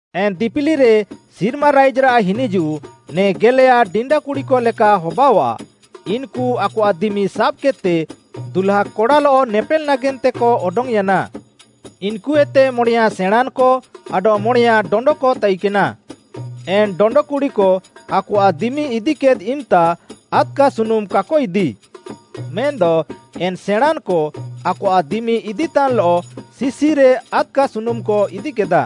“ଏନ୍‌ ଦିପିଲିରେ ସିର୍ମା ରାଇଜ୍‌ରାଃ ହିନିଜୁଃ ନେ ଗେଲେୟା ଡିଣ୍ଡାକୁଡ଼ିକ ଲେକା ହବାଅଃଆ, ଇନ୍‌କୁ ଆକଆଃ ଦିମି ସାବ୍‌କେଦ୍‌ତେ ଦୁହ୍ଲାକଡ଼ାଲଃ ନେପେଲ୍‌ ନାଗେନ୍ତେକ ଅଡଙ୍ଗ୍‌ୟାନା। ଇନ୍‌କୁଏତେ ମଣେୟାଁ ସେଣାଁଁନ୍‌କ ଆଡଃ ମଣେୟାଁ ଡଣ୍ଡକ ତାଇକେନା। ଏନ୍‍ ଡଣ୍ଡ କୁଡ଼ିକ ଆକଆଃ ଦିମି ଇଦିକେଦ୍‌ ଇମ୍‌ତା ଆଦ୍‌କା ସୁନୁମ୍‌ କାକ ଇଦି। ମେନ୍‌ଦ ଏନ୍‌ ସେଣାଁଁନ୍‌କ ଆକଆଃ ଦିମି ଇଦିତାନ୍‍ଲଃ ଶିଶିରେ ଆଦ୍‌କା ସୁନୁମ୍‌କ ଇଦିକେଦା।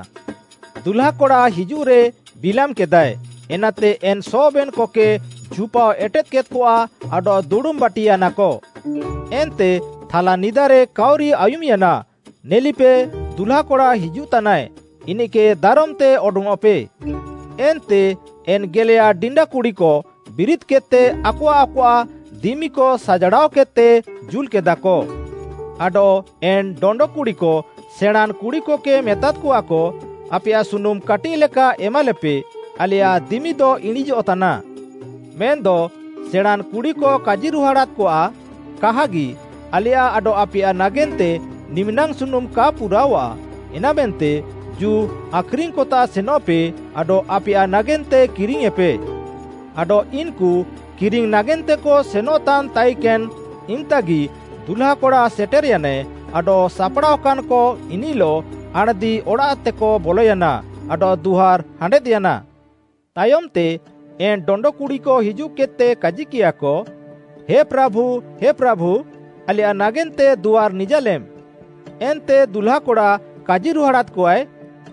ଦୁହ୍ଲାକଡ଼ା ହିଜୁଃରେ ବିଲାମ୍‌କେଦାଏ, ଏନାତେ ଏନ୍‍ ସବେନ୍‌କକେ ଝୁପାଅ ଏଟେଦ୍‌କେଦ୍‌କଆ ଆଡଃ ଦୁଡ଼ୁମ୍‌ ବାଟିୟାନାକ। “ଏନ୍ତେ ଥାଲା ନିଦାରେ କାଉରି ଆୟୁମ୍‌ୟାନା, ‘ନେଲିପେ, ଦୁହ୍ଲାକଡ଼ା ହିଜୁଃତାନାଏ, ଇନିଃକେ ଦାରମ୍‌ତେ ଅଡଙ୍ଗ୍‌ଅଃପେ।’ ଏନ୍ତେ ଏନ୍‌ ଗେଲେୟା ଡିଣ୍ଡାକୁଡ଼ିକ ବିରିଦ୍‌କେଦ୍‌ତେ ଆକଆଃ ଆକଆଃ ଦିମିକ ସାଜାଡ଼ାଅକେଦ୍‌ତେ ଜୁଲ୍‌କେଦାକ। ଆଡଃ ଏନ୍‍ ଡଣ୍ଡ କୁଡ଼ିକ ସେଣାଁଁନ୍‌ କୁଡ଼ିକକେ ମେତାଦ୍‌କଆକ, ‘ଆପେୟାଃ ସୁନୁମ୍‌ କାଟିଃଲେକା ଏମାଲେପେ ଆଲେୟାଃ ଦିମିଦ ଇଣିଁଜଃତାନା।’ ମେନ୍‌ଦ ସେଣାଁଁନ୍‌ କୁଡ଼ିକ କାଜିରୁହାଡ଼ାଦ୍‍କଆ, ‘କାହାଗି ଆଲେୟାଃ ଆଡଃ ଆପେୟାଃ ନାଗେନ୍ତେ ନିମିନାଙ୍ଗ୍‌ ସୁନୁମ୍‌ କା ପୁରାଅଃଆ, ଏନାମେନ୍ତେ ଜୁ ଆଖ୍‌ରିଙ୍ଗ୍‌କତାଃ ସେନଃପେ ଆଡଃ ଆପେୟାଃ ନାଗେନ୍ତେ କିରିଙ୍ଗ୍‌ୟେଁପେ।’ ଆଡଃ ଇନ୍‌କୁ କିରିଙ୍ଗ୍‌ ନାଗେନ୍ତେକ ସେନଃତାନ୍‌ ତାଇକେନ୍‌ ଇମ୍‍ତାଙ୍ଗ୍‌ଗି ଦୁହ୍ଲାକଡ଼ା ସେଟେର୍‍ୟାନାଏ ଆଡଃ ସାପ୍‌ଡ଼ାଅକାନ୍‍କ ଇନିଃଲଃ ଆଣ୍‌ଦି ଅଡ଼ାଃତେକ ବଲୟାନା, ଆଡଃ ଦୁଆର୍‌ ହାଣ୍ଡେଦ୍‍ୟାନା। “ତାୟମ୍‌ତେ ଏନ୍‌ ଡଣ୍ଡ କୁଡ଼ିକ ହିଜୁଃକେଦ୍‌ତେ କାଜିକିୟାକ, ‘ହେ ପ୍ରାଭୁ, ହେ ପ୍ରାଭୁ, ଆଲେୟାଃ ନାଗେନ୍ତେ ଦୁଆର୍‌ ନିଜାଲେମ୍‌।’ ଏନ୍ତେ ଦୁହ୍ଲାକଡ଼ା କାଜିରୁହାଡ଼ାଦ୍‍କଆଏ,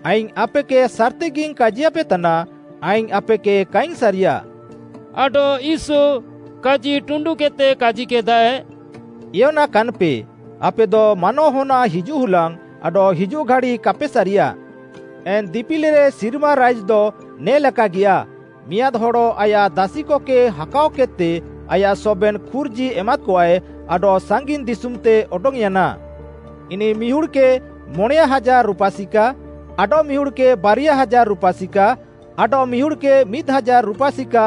‘ଆଇଙ୍ଗ୍‌ ଆପେକେ ସାର୍‌ତିଗିଙ୍ଗ୍‌ କାଜିୟାପେତାନା, ଆଇଙ୍ଗ୍‌ ଆପେକେ କାଇଙ୍ଗ୍‌ ସାରିୟାଃ।’” ଆଡଃ ୟୀଶୁ କାଜିଟୁଣ୍ଡୁକେଦ୍‌ତେ କାଜିକେଦାଏ, “ଏୟନାକାନ୍‍ପେ, ଆପେଦ ମାନୱାହନ୍‌ଆଃ ହିଜୁଃ ହୁଲାଙ୍ଗ୍‌ ଆଡଃ ହିଜୁଃ ଘାଡ଼ି କାପେ ସାରିୟା। “ଏନ୍‌ ଦିପିଲିରେ ସିର୍ମା ରାଇଜ୍‌ଦ ନେ ଲେକାଗିଆ, ମିଆଁଦ୍‌ ହଡ଼ ଆୟାଃ ଦାସିକକେ ହାକାଅକେଦ୍‌ତେ ଆୟାଃ ସବେନ୍‌ ଖୁର୍ଜି ଏମାଦ୍‍କଆଏ ଆଡଃ ସାଙ୍ଗିନ୍‌ ଦିଶୁମ୍‌ତେ ଅଡଙ୍ଗ୍‌ୟାନା। ଇନିଃ ମିହୁଡ଼୍‌କେ ମଣେୟାଁ ହାଜାର୍‌ ରୁପା ସିକା, ଆଡଃମିହୁଡ଼୍‌କେ ବାରିୟା ହାଜାର୍‌ ରୁପା ସିକା, ଆଡଃମିହୁଡ଼୍‌କେ ମିଦ୍‌ ହାଜାର୍‌ ରୁପା ସିକା,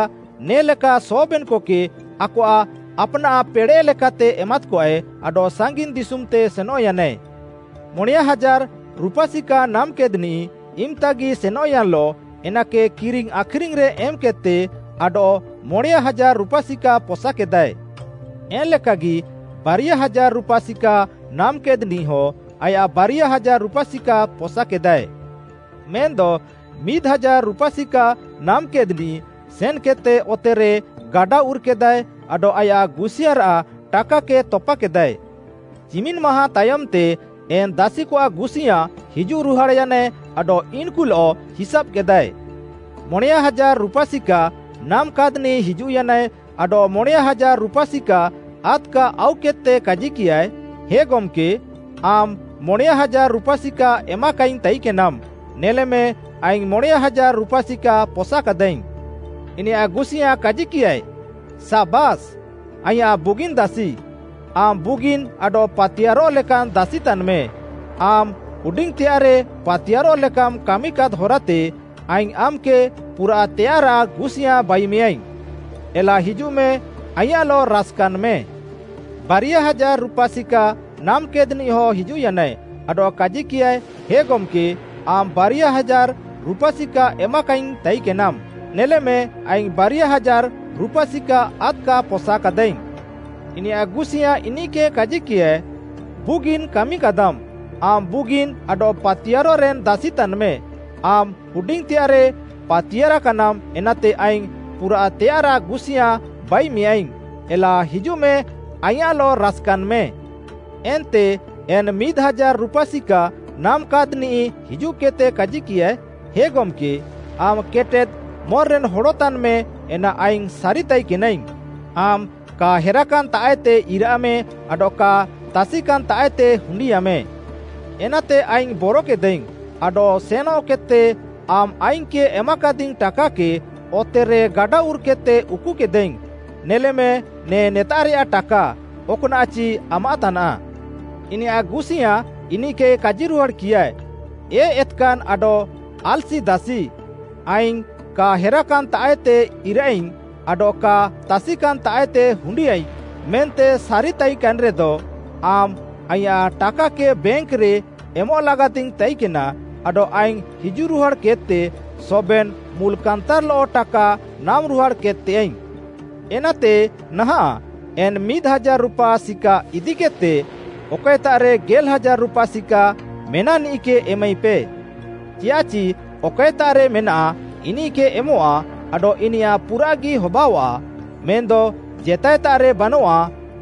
ନେ ଲେକା ସବେନ୍‌କକେ ଆକଆଃ ଆପ୍‌ନାଃ ପେଡ଼େଃ ଲେକାତେ ଏମାଦ୍‍କଆ ଆଡଃ ସାଙ୍ଗିନ୍‌ ଦିଶୁମ୍‌ତେ ସେନଃୟାନା। ମଣେୟାଁ ହାଜାର୍‌ ରୁପା ସିକା ନାମ୍‌କେଦ୍‌ନିଃ ଇମ୍‍ତାଗି ସେନଃୟାନ୍‌ଲଃ ଏନାକେ କିରିଙ୍ଗ୍‌ ଆଖ୍‌ରିଙ୍ଗ୍‌ରେ ଏମ୍‌କେଦ୍‌ତେ ଆଡଃ ମଣେୟାଁ ହାଜାର୍‌ ରୁପା ସିକା ପସାକେଦାଏ। ଏନ୍‌ଲେକାଗି ବାରିୟା ହାଜାର୍‌ ରୁପା ସିକା ନାମ୍‌କେଦ୍‌ନିଃହଁ ଆଡଃ ବାରିୟା ହାଜାର୍‌ ରୁପା ସିକା ପସାକେଦାଏ। ମେନ୍‌ଦ ମିଦ୍‌ ହାଜାର୍‌ ରୁପା ସିକା ନାମ୍‌କେଦ୍‌ନିଃ ସେନ୍‌କେଦ୍‌ତେ ଅତେରେ ଗାଡା ଉର୍‍କେଦାଏ ଆଡଃ ଆୟାଃ ଗୁସିୟାଁରାଃ ଟାକାକେ ତପାକେଦାଏ। “ଚିମିନ୍‍ ମାହାଁ ତାୟମ୍‌ତେ ଏନ୍‍ ଦାସିକଆଃ ଗୁସିୟାଁ ହିଜୁଃରୁହାଡ଼୍‌ୟାନାଏ ଆଡଃ ଇନ୍‍କୁଲଃ ହିସାବ୍‌କେଦାଏ। ମଣେୟାଁ ହାଜାର୍‌ ରୁପା ସିକା ନାମାକାଦ୍‌ନିଃ ହିଜୁଃୟାନାଏ ଆଡଃ ମଣେୟାଁ ହାଜାର୍‌ ରୁପା ସିକା ଆଦ୍‌କା ଆଉକେଦ୍‌ତେ କାଜିକିୟାଏ, ‘ହେ ଗମ୍‌କେ, ଆମ୍‌ ମଣେୟାଁ ହାଜାର୍‌ ରୁପା ସିକା ଏମାକାଇଙ୍ଗ୍‌ ତାଇକେନାମ୍‌, ନେଲେମେ ଆଇଙ୍ଗ୍‌ ମଣେୟାଁ ହାଜାର୍‌ ରୁପା ସିକା ପସାକାଦାଇଙ୍ଗ୍‌।’ ଇନିୟାଃ ଗୁସିୟାଁ କାଜିକିୟାଏ, ‘ସାବାସ୍‌, ଆଇଁୟାଃ ବୁଗିନ୍‌ ଦାସି! ଆମ୍‌ ବୁଗିନ୍‌ ଆଡଃ ପାତିୟାର୍‌ରଃ ଲେକାନ୍‌ ଦାସି ତାନ୍‌ମେ, ଆମ୍‌ ହୁଡିଙ୍ଗ୍‌ତେୟାଃରେ ପାତିୟାର୍‍ରଃ ଲେକାମ୍‌ କାମିକାଦ୍‌ ହରାତେ, ଆଇଙ୍ଗ୍‌ ଆମ୍‌କେ ପୁରାଃତେୟାଃରାଃ ଗୁସିୟାଁ ବାଇମେୟାଇଙ୍ଗ୍‌। ଏଲା ହିଜୁଃମେ, ଆଇଁୟାଃଲଃ ରାସ୍‌କାନ୍‌ମେ।’ “ବାରିୟା ହାଜାର୍‌ ରୁପା ସିକା ନାମାକାଦ୍‌ନିଃହଁ ହିଜୁଃୟାନାଏ ଆଡଃ କାଜିକିୟାଏ, ହେ ଗମ୍‌କେ, ଆମ୍‌ ବାରିୟା ହାଜାର୍‌ ରୁପା ସିକା ଏମାକାଇଙ୍ଗ୍‌ ତାଇକେନାମ୍‌, ନେଲେମେ ଆଇଙ୍ଗ୍‌ ବାରିୟା ହାଜାର୍‌ ରୁପା ସିକା ଆଦ୍‌କା ପସାକାଦାଇଙ୍ଗ୍‌। ଇନିୟାଃ ଗୁସିୟାଁ ଇନିଃକେ କାଜିକିୟାଏ, ‘ବୁଗିନ୍‌ କାମିକାଦାମ୍‌, ଆମ୍‌ ବୁଗିନ୍‌ ଆଡଃ ପାତିୟାର୍‌ରେନ୍‌ ଦାସି ତାନ୍‌ମେ, ଆମ୍‌ ହୁଡିଙ୍ଗ୍‌ତେୟାଃରେ ପାତିୟାର୍‍କାନାମ୍ ଏନାତେ ଆଇଙ୍ଗ୍‌ ପୁରାଃତେୟାଃରାଃ ଗୁସିୟାଁ ବାଇମେୟାଇଙ୍ଗ୍‌, ଏଲା ହିଜୁଃମେ, ଆଇଁୟାଃଲଃ ରାସ୍‌କାନ୍‌ମେ।’ “ଏନ୍ତେ ଏନ୍‌ ମିଦ୍‌ ହାଜାର୍‌ ରୁପା ସିକା ନାମାକାଦ୍‌ନିଃ ହିଜୁଃକେଦ୍‌ତେ କାଜିକିୟାଏ, ‘ହେ ଗମ୍‌କେ, ଆମ୍‌ କେଟେଦ୍‌ ମନ୍‍ରେନ୍‌ ହଡ଼ ତାନ୍‌ମେ ଏନା ଆଇଙ୍ଗ୍‌ ସାରିତାଇକେନାଇଙ୍ଗ୍‌। ଆମ୍‌ କା ହେରାକାନ୍‌ତାଃଏତେ ଇରାଃମେ ଆଡଃ କା ତାସିକାନ୍‌ତାଃଏତେ ହୁଣ୍ଡିୟାଃମେ। ଏନାତେ ଆଇଙ୍ଗ୍‌ ବରକେଦାଇଙ୍ଗ୍‌ ଆଡଃ ସେନଃକେଦ୍‌ତେ ଆମ୍‌ ଆଇଙ୍ଗ୍‌କେ ଏମାକାଦିଙ୍ଗ୍‌ ଟାକାକେ ଅତେରେ ଗାଡା ଉର୍‌କେଦ୍‌ତେ ଉକୁକେଦାଇଙ୍ଗ୍‌, ନେଲେମେ, ନେ ନେତାଃରେୟା ଟାକା, ଅକ୍‌ନାଃଚି ଆମାଃତାନାଃ।’ “ଇନିୟାଃ ଗୁସିୟାଁ ଇନିଃକେ କାଜିରୁହାଡ଼୍‌କିୟାଏ, ‘ଏ ଏତ୍‌କାନ୍‌ ଆଡଃ ଆଲ୍‌ସି ଦାସି, ଆଇଙ୍ଗ୍‌ କା ହେରାକାନ୍‌ତାଃଏତେ ଇରାଃଇଙ୍ଗ୍‌ ଆଡଃ କା ତାସିକାନ୍‌ତାଃଏତେ ହୁଣ୍ଡିୟାଃଇଙ୍ଗ୍‌ ମେନ୍ତେ ସାରିତାଇକେନ୍‌ରେଦ, ଆମ୍‌ ଆଇଁୟାଃ ଟାକାକେ ବ୍ୟାଙ୍କ୍‌ରେ ଏମଃ ଲାଗାତିଙ୍ଗ୍‌ ତାଇକେନା ଆଡଃ ଆଇଙ୍ଗ୍‌ ହିଜୁଃରୁହାଡ଼୍‌କେଦ୍‌ତେ ସବେନ୍‌ ମୁଲ୍‌'କାନ୍‌ତାର୍‌ଲଃ ଟାକା ନାମ୍‍ରୁହାଡ଼୍‌ କେଦ୍‌ତେୟାଃଇଙ୍ଗ୍‌। ଏନାତେ ନାହାଁଃ, ଏନ୍‌ ମିଦ୍‌ ହାଜାର୍‌ ରୁପା ସିକା ଇଦିକେଦ୍‌ତେ, ଅକଏତାଃରେ ଗେଲ୍‌ ହାଜାର୍‌ ରୁପା ସିକା ମେନାଃନିଃକେ ଏମାଇପେ। ଚିୟାଃଚି ଅକଏତାଃରେ ମେନାଃ, ଇନିଃକେ ଏମଃଆ ଆଡଃ ଇନିୟାଃ ପୁରାଃଗି ହବାଅଃଆ, ମେନ୍‌ଦ ଜେତାଏତାଃରେ ବାନଃଆ,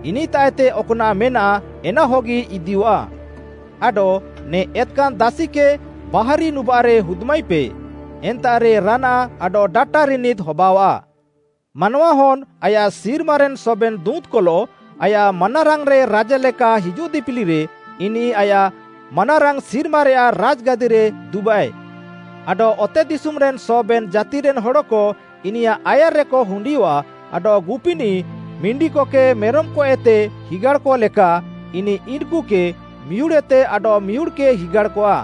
ଇନିଃତାଃଏତେ ଅକ୍‌ନାଃ ମେନାଃ ଏନାହଗି ଇଦିୟଃଆ। ଆଡଃ ନେ ଏତ୍‌କାନ୍‌ ଦାସିକେ ବାହାରି ନୁବାଃରେ ହୁଦ୍‌ମାଇପେ, ଏନ୍ତାଃରେ ରାନାଃ ଆଡଃ ଡାଟା ରିନିଦ୍‌ ହବାଅଆଃ।’ “ମାନୱାହନ୍‌ ଆୟାଃ ସିର୍ମାରେନ୍‌ ସବେନ୍‌ ଦୁଁତ୍‌କଲଃ ଆୟାଃ ମାନାରାଙ୍ଗ୍‌ରେ ରାଜା ଲେକା ହିଜୁଃ ଦିପିଲିରେ ଇନିଃ ଆୟାଃ ମାନାରାଙ୍ଗ୍‌ ସିର୍ମାରେୟାଃ ରାଜ୍‌ଗାଦିରେ ଦୁବାଃଏ। ଆଡଃ ଅତେଦିଶୁମ୍‌ରେନ୍‌ ସବେନ୍‌ ଜାତିରେନ୍‍ ହଡ଼କ ଇନିୟାଃ ଆୟାର୍‍ରେକ ହୁଣ୍ଡିୟଃଆ ଆଡଃ ଗୁପିନିଃ ମିଣ୍ଡିକକେ ମେରମ୍‌କଏତେ ହିଗାଡ଼୍‌କ ଲେକା ଇନିଃ ଇନ୍‌କୁକେ ମିହୁଡ଼୍‌ଏତେ ଆଡଃମିହୁଡ଼୍‌କେ ହିଗାଡ଼୍‌କଆ।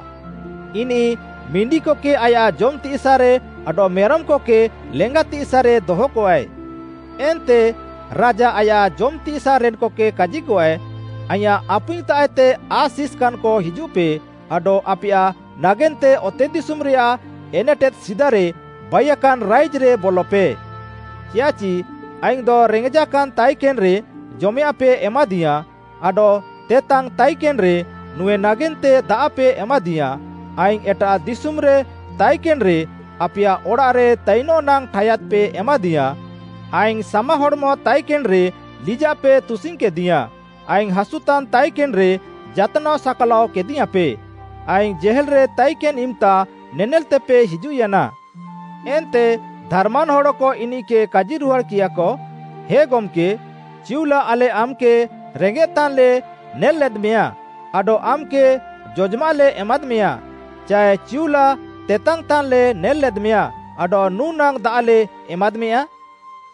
ଇନିଃ ମିଣ୍ଡିକକେ ଆୟାଃ ଜମ୍‌ତିସାଃରେ ଆଡଃ ମେରମ୍‌କକେ ଲେଙ୍ଗାତିସାଃରେ ଦହକଆଏ। ଏନ୍ତେ ରାଜା ଆୟାଃ ଜମ୍‍ତିସାଃରେନ୍‌କକେ କାଜିକଆଏ, ‘ଆଇଁୟାଃ ଆପୁଇଙ୍ଗ୍‌ତାଃଏତେ ଆଶିଷ୍‌କାନ୍‍କ ହିଜୁଃପେ ଆଡଃ ଆପେୟାଃ ନାଗେନ୍ତେ ଅତେଦିଶୁମ୍‌ରେୟାଃ ଏନେଟେଦ୍‌ ସିଦାରେ ବାଇୟାକାନ୍‌ ରାଇଜ୍‌ରେ ବଲପେ। ଚିୟାଃଚି ଆଇଙ୍ଗ୍‌ଦ ରେଙ୍ଗେଜାକାନ୍‍ ତାଇକେନ୍‌ରେ ଜମେୟାଃଁପେ ଏମାଦିୟାଁ, ଆଡଃ ତେତାଙ୍ଗିଙ୍ଗ୍‌ ତାଇକେନ୍‌ରେ ନୁଁଏ ନାଗେନ୍ତେ ଦାଆଃପେ ଏମାଦିୟାଁ, ଆଇଙ୍ଗ୍‌ ଏଟାଃ ଦିଶୁମ୍‌ରେ ତାଇକେନ୍‌ରେ ଆପେୟାଃ ଅଡ଼ାଃରେ ତାଇନ୍‌ ନାଙ୍ଗ୍‌ ଠାୟାଦ୍‌ପେ ଏମାଦିୟାଁ, ଆଇଙ୍ଗ୍‌ ସାମାହଡ଼୍‌ମ ତାଇକେନ୍‌ରେ ଲିଜାଃପେ ତୁସିଙ୍ଗ୍‌କେଦିୟାଁ, ଆଇଙ୍ଗ୍‌ ହାସୁତାନ୍ ତାଇକେନ୍‌ରେ ଯାତ୍‌ନାଅ ସାକ୍‌ଲାଅ କେଦିୟାଁପେ, ଆଇଙ୍ଗ୍‌ ଜେହେଲ୍‌ରେ ତାଇକେନ୍‌ ଇମ୍‌ତା ନେନେଲ୍‌ତେପେ ହିଜୁଃୟାନା।’ “ଏନ୍ତେ ଧାର୍‌ମାନ୍‌ ହଡ଼କ ଇନିଃକେ କାଜିରୁହାଡ଼୍‌କିୟାକ, ‘ହେ ଗମ୍‌କେ, ଚିଉଲା ଆଲେ ଆମ୍‌କେ ରେଙ୍ଗେତାନ୍‍ଲେ ନେଲ୍‌ଲେଦ୍‌ମେୟାଁ ଆଡଃ ଆମ୍‌କେ ଜଜମାଃଲେ ଏମାଦ୍‍ମେୟାଁ, ଚାଏ ଚିଉଲା ତେତାଙ୍ଗ୍‌ତାନ୍‌ଲେ ନେଲ୍‌ଲେଦ୍‌ମେୟାଁ ଆଡଃ ନୁଁ ନାଙ୍ଗ୍‌ ଦାଆଃଲେ ଏମାଦ୍‌ମେୟାଁ?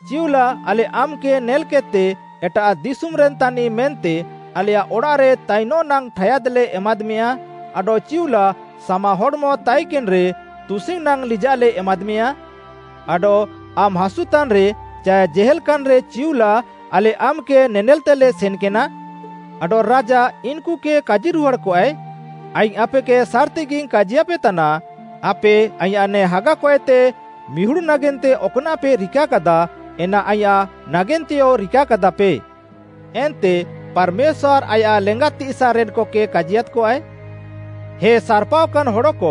ଚିଉଲା ଆଲେ ଆମ୍‌କେ ନେଲ୍‌କେଦ୍‌ତେ ଏଟାଃ ଦିଶୁମ୍‌ରେନ୍‌ ତାନିଃ ମେନ୍ତେ ଆଲେୟାଃ ଅଡ଼ାଃରେ ତାଇନ୍‌ ନାଙ୍ଗ୍‌ ଠାୟାଦ୍‌ଲେ ଏମାଦ୍‌ମେୟାଁ ଆଡଃ ଚିଉଲା ସାମାହଡ଼୍‌ମ ତାଇକେନ୍‌ରେ ତୁସିଙ୍ଗ୍‌ ନାଙ୍ଗ୍‌ ଲିଜାଃଲେ ଏମାଦ୍‌ମେୟାଁ? ଆଡଃ ଆମ୍‌ ହାସୁତାନ୍‌ରେ ଚାଏ ଜେହେଲ୍‍କାନ୍‌ରେ ଚିଉଲା ଆଲେ ଆମ୍‌କେ ନେନେଲ୍‌ତେଲେ ସେନ୍‌କେନା?’ ଆଡଃ ରାଜା ଇନ୍‌କୁକେ କାଜିରୁହାଡ଼୍‌କଆଏ, ‘ଆଇଙ୍ଗ୍‌ ଆପେକେ ସାର୍‌ତିଗିଙ୍ଗ୍‌ କାଜିୟାପେତାନା, ଆପେ ଆଇଁୟାଃ ନେ ହାଗାକଏତେ ମିହୁଡ଼୍‌ ନାଗେନ୍ତେ ଅକ୍‌ନାଃପେ ରିକାକାଦା, ଏନା ଆଇଁୟାଃ ନାଗେନ୍ତେୟ ରିକାକାଦାପେ।’ “ଏନ୍ତେ ପାର୍‌ମେଶ୍ୱାର୍‌ ଆୟାଃ ଲେଙ୍ଗାତିସାଃରେନ୍‍କକେ କାଜିୟାଦ୍‌କଆଏ, ‘ହେ ସାର୍‍ପାଅକାନ୍‍ ହଡ଼କ!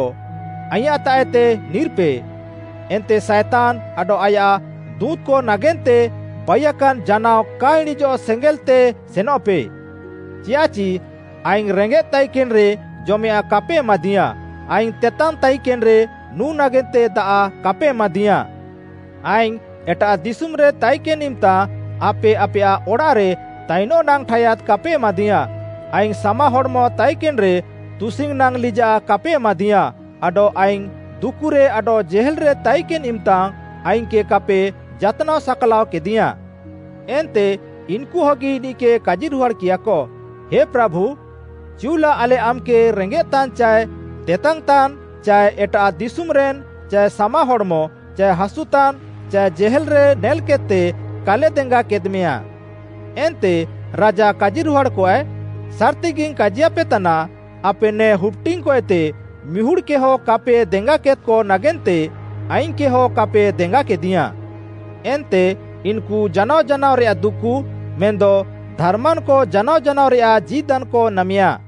ଆଇଁୟାଃତାଃଏତେ ନିର୍‌ପେ ଏନ୍ତେ ସାଏତାନ୍‌ ଆଡଃ ଆୟାଃ ଦୁଁତ୍‌କ ନାଗେନ୍ତେ ବାଇୟାକାନ୍‌ ଜାନାଅ କା ଇଣିଁଜଃ ସେଙ୍ଗେଲ୍‌ତେ ସେନଃପେ। ଚିୟାଃଚି ଆଇଙ୍ଗ୍‌ ରେଙ୍ଗେଃ ତାଇକେନ୍‌ରେ ଜମେୟାଃଁ କାପେ ଏମାଦିୟାଁ, ଆଇଙ୍ଗ୍‌ ତେତାଙ୍ଗ୍‌ ତାଇକେନ୍‌ରେ ନୁଁ ନାଗେନ୍ତେ ଦାଆଃ କାପେ ଏମାଦିୟାଁ। ଆଇଙ୍ଗ୍‌ ଏଟାଃ ଦିଶୁମ୍‌ରେ ତାଇକେନ୍‌ ଇମ୍‌ତା ଆପେ ଆପେୟାଃ ଅଡ଼ାଃରେ ତାଇନ୍‌ ନାଙ୍ଗ୍‌ ଠାୟାଦ୍‌ କାପେ ଏମାଦିୟାଁ, ଆଇଙ୍ଗ୍‌ ସାମାହଡ଼୍‌ମ ତାଇକେନ୍‌ରେ ତୁସିଙ୍ଗ୍‌ ନାଙ୍ଗ୍‌ ଲିଜାଃ କାପେ ଏମାଦିୟାଁ, ଆଡଃ ଆଇଙ୍ଗ୍‌ ଦୁକୁରେ ଆଡଃ ଜେହେଲ୍‌ରେ ତାଇକେନ୍‌ ଇମ୍‌ତା ଆଇଙ୍ଗ୍‌କେ କାପେ ଯାତ୍‌ନାଅ ସାକ୍‌ଲାଅ କେଦିୟାଁ।’ “ଏନ୍ତେ ଇନ୍‍କୁହଗି ଇନିଃକେ କାଜିରୁହାଡ଼ିୟାକ, ‘ହେ ପ୍ରାଭୁ, ଚିଉଲା ଆଲେ ଆମ୍‌କେ ରେଙ୍ଗେଃତାନ୍ ଚାଏ ତେତାଙ୍ଗ୍‌ତାନ୍ ଚାଏ ଏଟାଃ ଦିଶୁମ୍‌ରେନ୍‌, ଚାଏ ସାମାହଡ଼୍‌ମ, ଚାଏ ହାସୁତାନ୍, ଚାଏ ଜେହେଲ୍‌ରେ ନେଲ୍‌କେଦ୍‌ତେ କାଲେ ଦେଙ୍ଗାକେଦ୍‌ମେୟାଁ।’ ଏନ୍ତେ ରାଜା କାଜିରୁହାଡ଼୍‌କଆଏ, ‘ସାର୍‌ତିଗିଙ୍ଗ୍‌ କାଜିୟାପେତାନା, ଆପେ ନେ ହୁପ୍‌ଡିଙ୍ଗ୍‌କଏତେ ମିହୁଡ଼୍‌କେହଁ କାପେ ଦେଙ୍ଗାକେଦ୍‌କ ନାଗେନ୍ତେ ଆଇଙ୍ଗ୍‌କେହଁ କାପେ ଦେଙ୍ଗାକେଦିୟାଁ।’ ଏନ୍ତେ ଇନ୍‌କୁ ଜାନାଅ ଜାନାଅରେୟାଃ ଦୁକୁ, ମେନ୍‌ଦ ଧାର୍‌ମାନ୍‌କ ଜାନାଅ ଜାନାଅରେୟାଃ ଜୀଦାନ୍‌କ ନାମେୟା।”